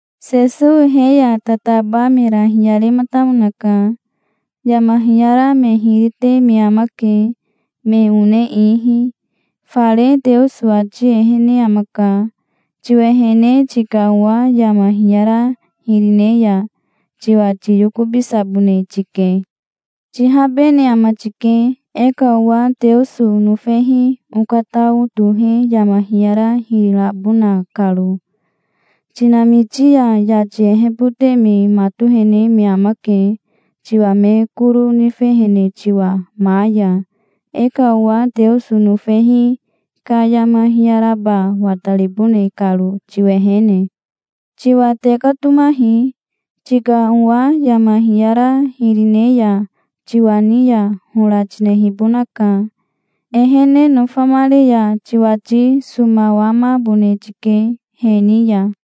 Sesowi he ya tataba mera hiyarematamonaka. "Yama hiyara me hiri te me amake, me one ihi. Fare Teoso ati ehene amaka. Tiwehene tika owa yama hiyara hiri ne ya, tiwa tiyokobisabone tike. Tihabene ama tike, e ka owa Teoso nofehi okatao tohe yama hiyara hiri rabona karo. Tinamiti ya yati ehebote me matohene me amake, tiwa me koro nifehene tiwa ma ya, e ka owa Teoso nofehi ka yama hiyaraba wataribone karo, tiwehene". "Tiwa tekatomahi. Tika owa yama hiyara hiri ne ya tiwa ni ya hora tinehibonaka. Ehene nofamare ya tiwati somawamabone tike, he ni ya.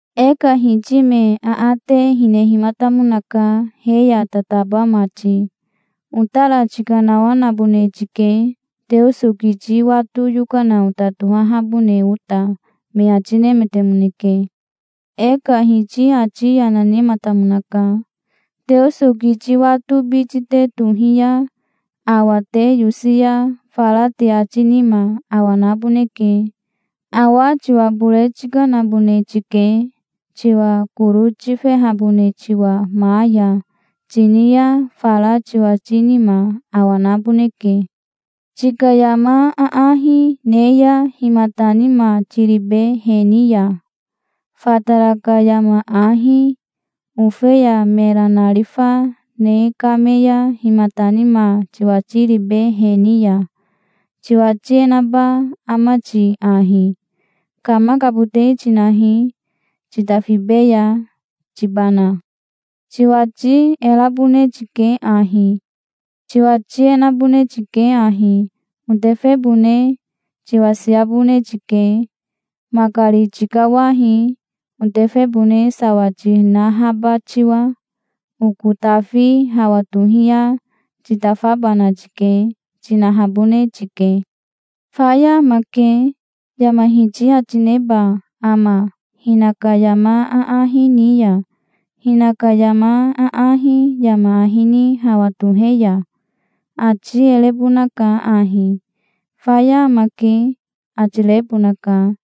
E ka Hiti me aate hinehimatamonaka he ya tataba mati. "Otara tikanawanabone tike, Teoso kiti wato yokana ota tohahabone ota", me ati nemetemoneke. E ka Hiti ati yana nematamonaka. "Teoso kiti wato biti te tohi ya awa te yosi ya, fara te ati nima awa naboneke. 'Awa tiwa bore tikanabone tike, tiwa koro tifehabone tiwa ma ya', tini ya fara tiwati nima awa naboneke". "Tika yama aahi ne ya himata nima tiribe he ni ya? Fatara ka yama ahi, ofeya mera narifa, ne kame ya himata nima tiwati ribe he ni ya? Tiwati e naba ama ti ahi: 'Kamakabote tinahi, titafibeya', tibana? Tiwati e rabone tike ahi. Tiwati e nabone tike ahi: 'Otefebone tiwasiabone tike. Makari tikawahi, otefebone sawa tinahaba tiwa. Oko tafi hawa tohi ya titafabana tike', tinahabone tike. 'Faya amake', yama hiti ati neba ama, hinaka yama aahi ni ya, hinaka yama aahi yama ahi ni hawa tohe ya? Ati e rebonaka ahi. 'Faya amake', ati rebonaka,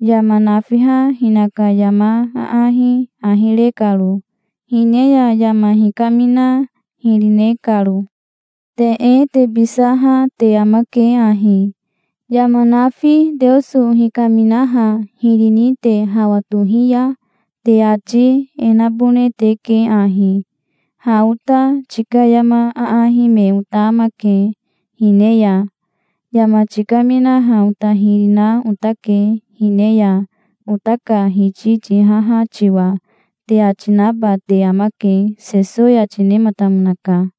yama nafiha hinaka yama aahi ahi re karo, hine ya yama hikamina hiri ne karo. Te e tebisaha te amake ahi. Yama nafi Teoso hikaminaha hiri ni te hawa tohi ya, te ati e nabone teke ahi: 'Ha ota tika yama aahi me ota amake, hine ya. Yama tikaminaha ota hiri na otake hine ya, ota ka Hiti tihaha tiwa', te ati naba te amake", Sesowi ati nematamonaka.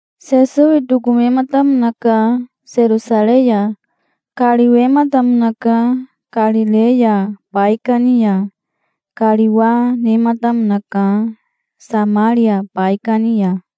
Sesowi tokomematamonaka Serosarei ya. Kariwematamonaka Karireya baikani ya. Kariwa nematamonaka Samaria baikani ya.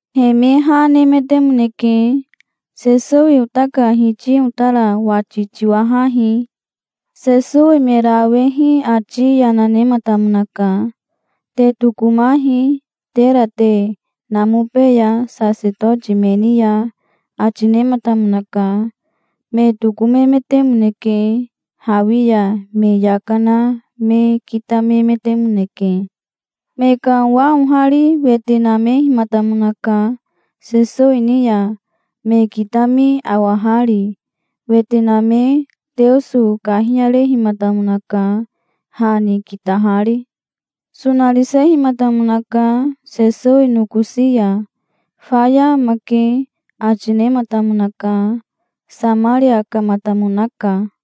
He me ha nemetemoneke. "Sesowi ota ka Hiti otara wati tiwahahi". Sesowi mera awehi ati yana nematamonaka. "Te tokomahi, tera te namobeya sasetoti me ni ya", ati nematamonaka. Me tokomemetemoneke. Hawi ya me yaka na me kitamemetemoneke. Me ka owa ohari wete namehimatamonaka Sesowi ni ya, me kitami awahari. Wete name Teoso kahiyarehimatamonaka, ha ni kitahari. Sonarisehimatamonaka Sesowi nokosi ya. "Faya amake", ati nematamonaka. Samaria kamatamonaka.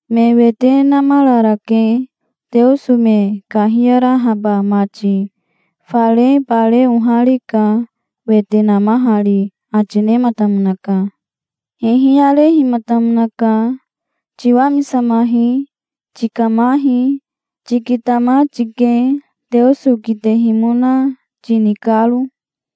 Me wete namararake, Teoso me kahiyarahaba mati. Fare bare oharika, wete namahari", ati nematamonaka. Hihiyarehimatamonaka. "Tiwamisamahi. Tikamahi. Tikitama tike, Teoso kitehimona tini karo".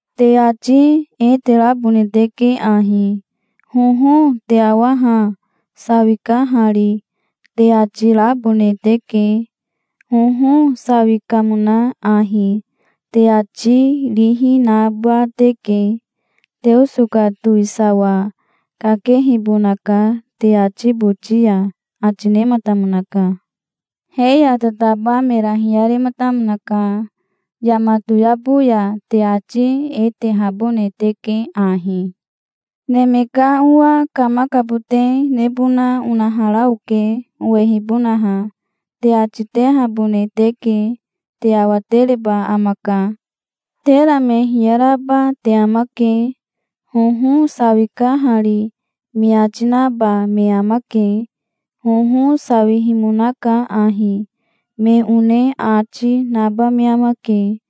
Te ati e terabone teke ahi: 'Hoho, te awa ha. Sawika hari", te ati rabone teke. "Hoho, sawi kamona ahi", te ati rihi naba teke. Teoso ka towisawa kakehibonaka te ati boti ya", ati nematamonaka. He ya tataba mera hiyarematamonaka. "Yama toyabo ya te ati e tehabone teke ahi: 'Neme ka Owa kamakabote nebona onahara oke, owehibonaha', te ati tehabone teke. Te awatereba amaka. Tera me hiyaraba te amake. 'Hoho sawika hari', me ati naba me amake. 'Hoho sawihimonaka ahi', me one ati, naba me amake.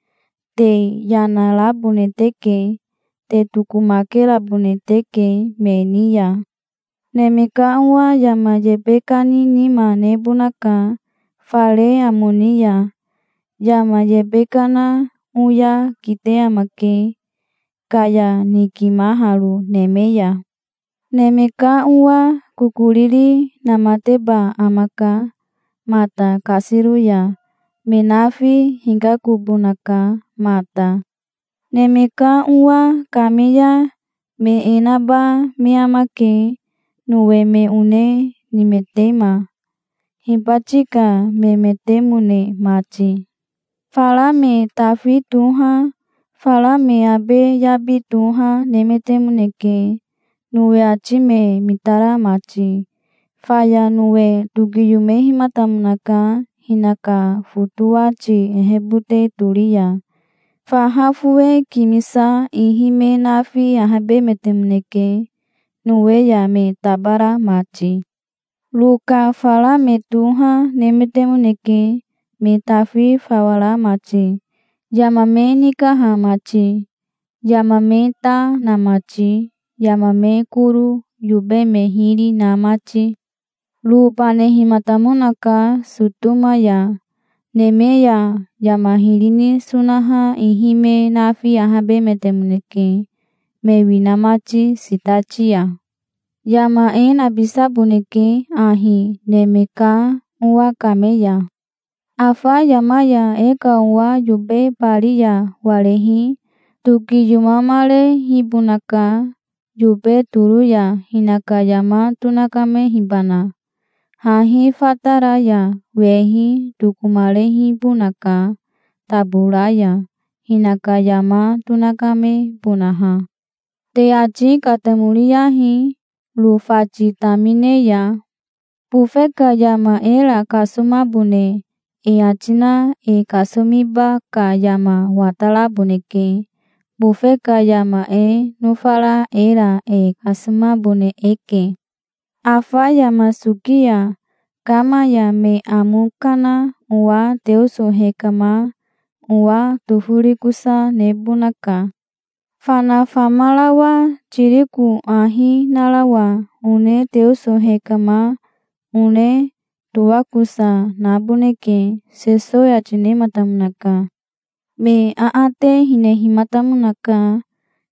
Te yana rabone teke. Te tokomakerabone teke me ni ya. Neme ka Owa yama yebe kani nima nebonaka fare amo ni ya. Yama yebe kana oya kite amake, kaya nikimaharo neme ya". "Neme ka Owa kokoriri namateba amaka mata kasiro ya. Me nafi hikakobonaka mata. Neme ka Owa kame ya me e naba me amake, Nowe me one nimetema, hibati ka memetemone mati. Fara me tafi toha, fara me abe yabi toha, nemetemoneke, Nowe ati me mitara mati. Faya Nowe tokiyomehimatamonaka hinaka fotowati ehebote tori ya. Faha fowe kimisa ihi me nafi ahabemetemoneke, Nowe ya me tabara mati. Ro ka fara me toha nemetemoneke, me tafi fawa ra mati, yama me nikaha mati, yama me ta na mati, yama me koro, yobe me hiri, na mati. Ro banehimatamonaka Sotoma ya. Neme ya yama hiri ni sonaha ihi me nafi ahabemetemoneke, me wina mati sitati ya". "Yama e nabisaboneke ahi Neme ka Owa kame ya. Afa yama ya e ka owa yobe bari ya warehi tokiyomamarehibonaka yobe toro ya, hinaka yama tonakamehibana. Hahi fatara ya wehi tokomarehibonaka tabora ya, hinaka yama tonakamebonaha. Te ati katamoriyahi Ro fati tamine ya. Bofe ka yama era kasomabone e ati na e kasomiba ka yama wataraboneke. Bofe ka yama e nofara era e kasomabone eke. Afa yama soki ya kama ya me amo kana owa Teoso hekama, owa toforikosa, nebonaka. Fana famarawa tiriko ahi narawa one Teoso hekama, one toakosa, naboneke", Sesowi ati nematamonaka. Me aate hinehimatamonaka.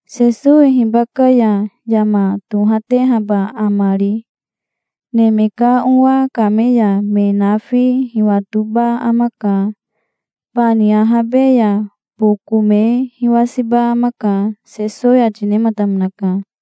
"Sesowi hibaka ya yama tohatehaba amari?" "Neme ka Owa kame ya me nafi hiwatoba amaka. Bani ahabe ya boko me hiwasiba amaka", Sesowi ati nematamonaka.